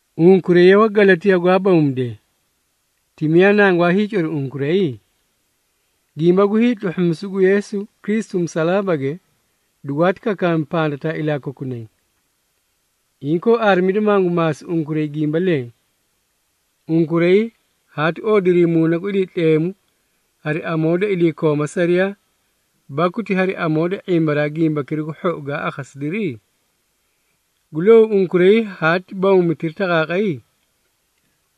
Unkuray ye Wagalatiyaa gwaa bawmidee! Ti miyaa nangwaa hiicori unkuray? Gimba gu hiitluhhumisu gu Yeesu Kristu musalaabage dugwaati kakaami pandataa ilaa kokunay. Inkoo, aarimida mangu maasi unkuray gimba leẽ. Unkuray haati oodirii Muuna gu Iliitleemu hari amoo da iliikooma sariyaa, baku ti hari amoo da ⁄imbaraa Gimbakira gu Hhou gaa akhasidiri? Gu louu unkuray haati bawmitirii taqaaqay?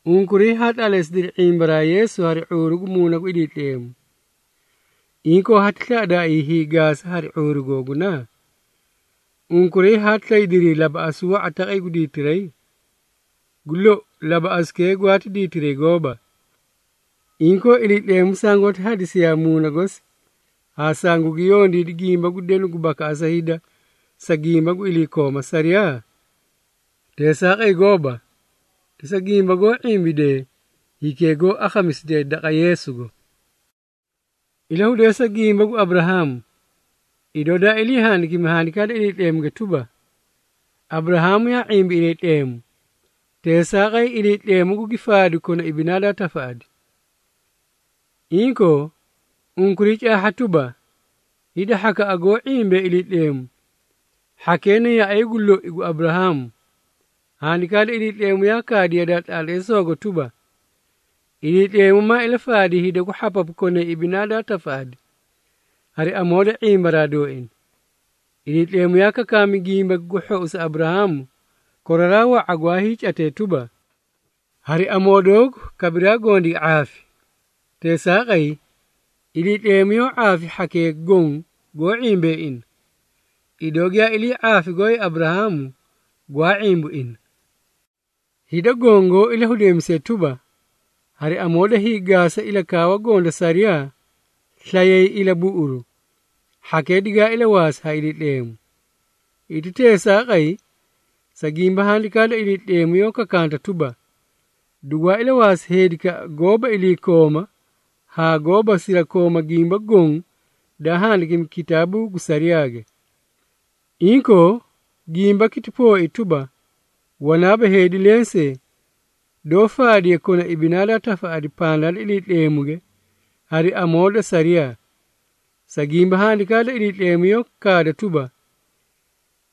Unkuray haa tlaatleesidiri ⁄imbaraa Yeesu hari ⁄uuru gu Muuna gu Iliitleemu, inkoo hati slaꞌadaaii hiigaasa hari ⁄uuru googuna? Unkuray haati slaydirii labaꞌasu wa⁄a taqay gu diitiray? Gu lou, labaꞌasukee gwaati diitiray gooba! Inkoo, Iliitleemu sangoóti hadisiyaa Muuna gosi haa sangugi yondiidi gimba gu denu gu bakaꞌasa hida, sa gimba gu iliikooma sariyaa? Teesaaqay goóba, ti sa gimba goó ⁄imbidee hikee goó akhamisidee daqa Yeesugo. Ilahudeesa gimba gu Aburahaamu, idoo daa ilii handikimi Handikaa da Iliitleemuge tuba, “Aburahaamu yaa ⁄imbi Iliitleemu, teesaaqay Iliitleemu gugi faadi kona ibinaa daa tafaꞌadi.” Inkoo, unkuray caahha tuba, hida hhakaꞌa goó ⁄imbee Iliitleemu, hhakee na yaꞌay gu loi gu Aburahaamu. Handikaa da Iliitleemu yaa kaadi yadaa tlaatleesoogo tuba, Iliitleemu maa ilafaadi hida gu hhapapu konay ibinaa daa tafaꞌadi, hari amoo da ⁄imbaraa dooina. Iliitleemu yaa kakaami Gimbaki gu Hhou sa Aburahaamu, koraraa wa⁄a gwaay catee tuba, “Hari amoo doogu kabiraa goõ digi ⁄aafi.” Teesaaqay, Iliitleemu yoó ⁄aafi hhakee goõ goó ⁄imbee ina, idoo giyaa ilii ⁄aafi gooay Aburahaamu gwaa ⁄imbu ina. Hida goõ goó ilahudeemisee tuba, hari amoo da hiigaasa ilakaawa goõ da sariyaa slayay ilabuꞌuru, hhakee digaa ilawaasi ha Iliitleemu. Hiti teesaaqay, sa gimba Handikaa da Iliitleemu yoó kakanta tuba, “Dugwaa ilawaasi heedikaꞌa goóba iliikooma haa goóba sirakooma gimba goõ daa handikimi kitaabuu gu sariyaage.” Inkoo, gimbaki ti pooi tuba, wanaaba heedi lensee, doó faadiye kona ibinaa daa tafaꞌadi pandaa da Iliitleemuge, hari amoo da sariyaa, sa gimba Handikaa da Iliitleemu yoó kaada tuba,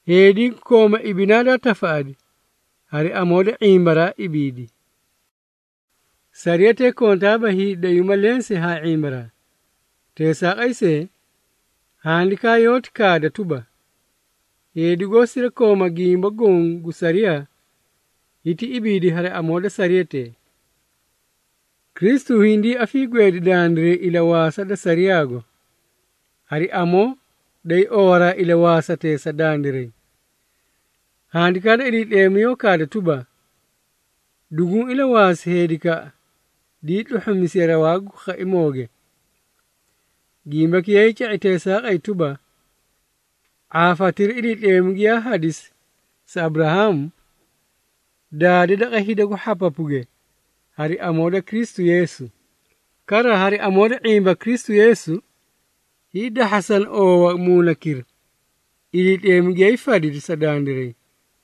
“Heedi gu kooma ibinaa daa tafaꞌadi, hari amoo da ⁄imbaraa ibiidi.” Sariyatee kontaaba hiidayuuma lensee haa ⁄imbaraa. Teesaaqay see, Handikaa yoóti kaada tuba, “Heedi goó sirakooma gimba goõ gu sariyaa, hiti ibiidi hari amoo da sariyatee.” Kristu hindii afiigweedi dandiray ilawaasa da sariyaago, hari amoo day owaraa ilawaasatee sa dandiray. Handikaa da Iliitleemu yoó kaada tuba, “Duguũ ilawaasi heedikaꞌa dii tluhhumisiye rawaa gu khaimooge.” Gimbaki yaay ca⁄i teesaaqay tuba, ⁄aafatira Iliitleemu giyaa hadisi sa Aburahaamu, daade daqa hida gu hhapapuge hari amoo da Kristu Yeesu. Kara, hari amoo da ⁄imba Kristu Yeesu, hiidahhasana oowa Muunakira, Iliitleemu giyaa hiifadidi sa dandiray.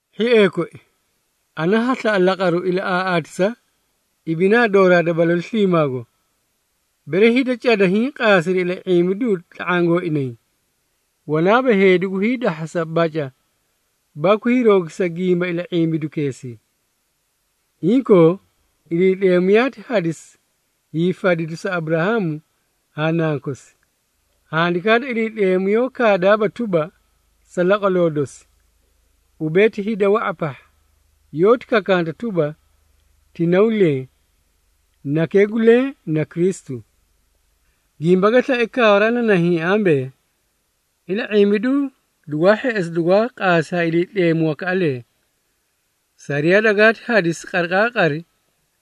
Hhiee koi, ana ha slaꞌa laqaru ilaꞌaaꞌaatisa ibinaa dooraa da balalu sliimaago. Bere hida cada hiĩ qaasiri ila⁄imbidu tla⁄aã gooinay, wanaaba heedi gu hiidahhasa baca baku hiiroogisa gimba ila⁄imbidukeesii. Inkoo, Iliitleemu yaati hadisi hiifadidu sa Aburahaamu haa nankosi. Handikaa da Iliitleemu yoó kaadaaba tuba, “Sa laqwaloo dosi,” ubee ti hida wa⁄a pahha. Yoóti kakanta tuba, “Ti naw leẽ.” Nakee gu leẽ na Kristu. Gimba ga slae kaawaraa na nahiĩ ambee, ila⁄imbidu dugwaa hheꞌesi dugwaa qaasi ha Iliitleemu wakaꞌalee. Sariyaa dagaati hadisi qariqaaqari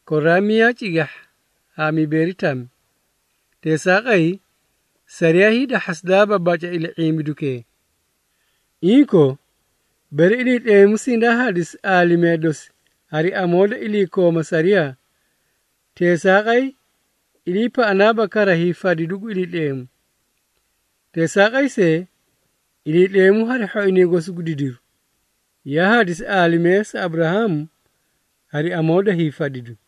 koraraa miyaa cigahha haa mibeeri tami. Teesaaqay, sariyaa hiidahhasidaaba baca ila⁄imbidukee. Inkoo, bere Iliitleemu sindaa hadisi aalimee dosi hari amoo da iliikooma sariyaa, teesaaqay iliipaꞌanaaba kara hiifadidu gu Iliitleemu. Teesaaqay see, Iliitleemu hari hhoinay gosi gu didiru, yaa hadisi aalimee sa Aburahaamu hari amoo da hiifadidu.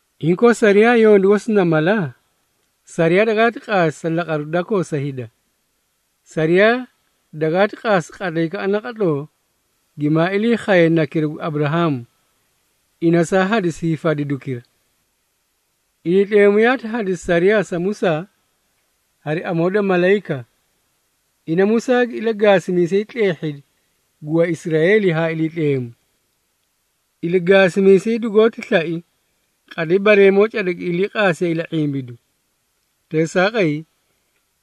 Inkoo, sariyaa yondu gosi na mala? Sariyaa dagaati qaasi sa laqaru dakoo sa hida. Sariyaa dagaati qaasi qatlaykaꞌa naqatloo gimaa ilii khaye Nakira gu Aburahaamu, ina saa hadisi hiifadidukira. Iliitleemu yaati hadisi sariyaa sa Musaa hari amoo da malayika. Ina Musaa gi ilagaasimiisay tleehhidi gu Waisraeeli haa Iliitleemu. Ilagaasimiisay dugoóti slai qatlay bareemoo cada gi iliiqaasiyee ila⁄imbidu. Teesaaqay,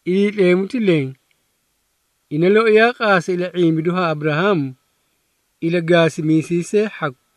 Iliitleemu ti leẽ, ina loi yaa qaasi ila⁄imbidu haa Aburahaamu ilagaasimiisay see hhaku.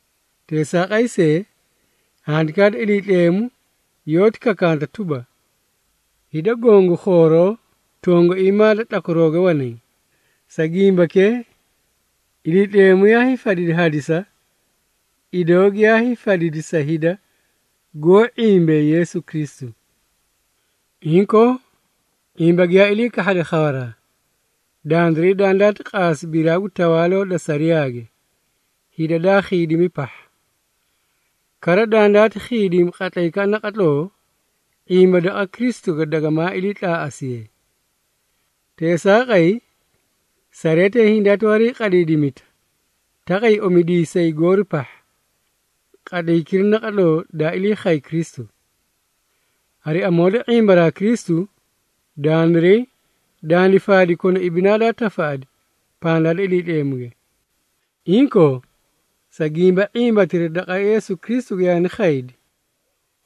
Teesaaqay see, Handikaa da Iliitleemu yoóti kakanta tuba, hida goõ gu khooroo tongaiimaa da tlakwarooge wanay. Sa gimbakee, Iliitleemu yaa hiifadidi hadisa idoo giyaa hiifadidi sa hida goó ⁄imbee Yeesu Kristu. Inkoo, ⁄imba giyaa ilii kahhade khawaraa, dandiray dandaati qaasi biraa gu tawaaloo da sariyaage hida daa khiidimi pahha. Kara, dandaati khiidimi qatlaykaꞌa naqatloo ⁄imba daqa Kristuge dagamaa iliitlaaꞌasiye. Teesaaqay, sariyatee hindaati wariiqadiidimita taqay omidiisay goori pahha, qatlaykira naqatloo daa ilii khay Kristu. Hari amoo da ⁄imbaraa Kristu, dandiray dandi faadi kona ibinaa daa tafaꞌadi pandaa da Iliitleemuge. Inkoo, sa gimba ⁄imbatira daqa Yeesu Kristuge yaani khaydi,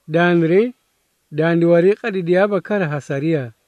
dandiray dandi wariiqadidiyaaba kara ha sariyaa.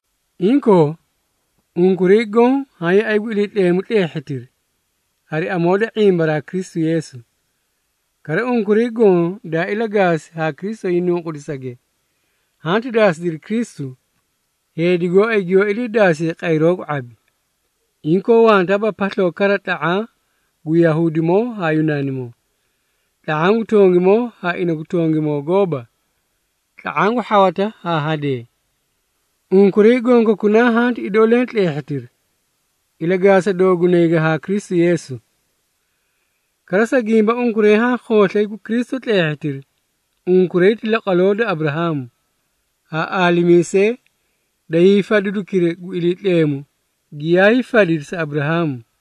Inkoo, unkuray goõ haã yaꞌay gu Iliitleemu tleehhitiri, hari amoo da ⁄imba Kristu Yeesu. Kara, unkuray goõ daa ilagaasi haa Kristu hiinunqudisage, hanti daasidiri Kristu, heedi gooay giyoó iliidaasiye qayroo gu ⁄abi. Inkoo, wantaaba pasloo kara tla⁄aã gu Yahuudimoo haa Yunaanimoo, tla⁄aã gu tongimoo haa ina gu tongimoo gooba, tla⁄aã gu hhawata haa hadee. Unkuray gonkokunaa hanti idoo leẽ tleehhitiri ilagaasa doogunayge haa Kristu Yeesu. Kara, sa gimba unkuray haã khooslay gu Kristu tleehhitiri, unkuray ti laqwaloo da Aburahaamu, haa aalimiisee da hiifadidukira gu Iliitleemu, giyaa hiifadidi sa Aburahaamu.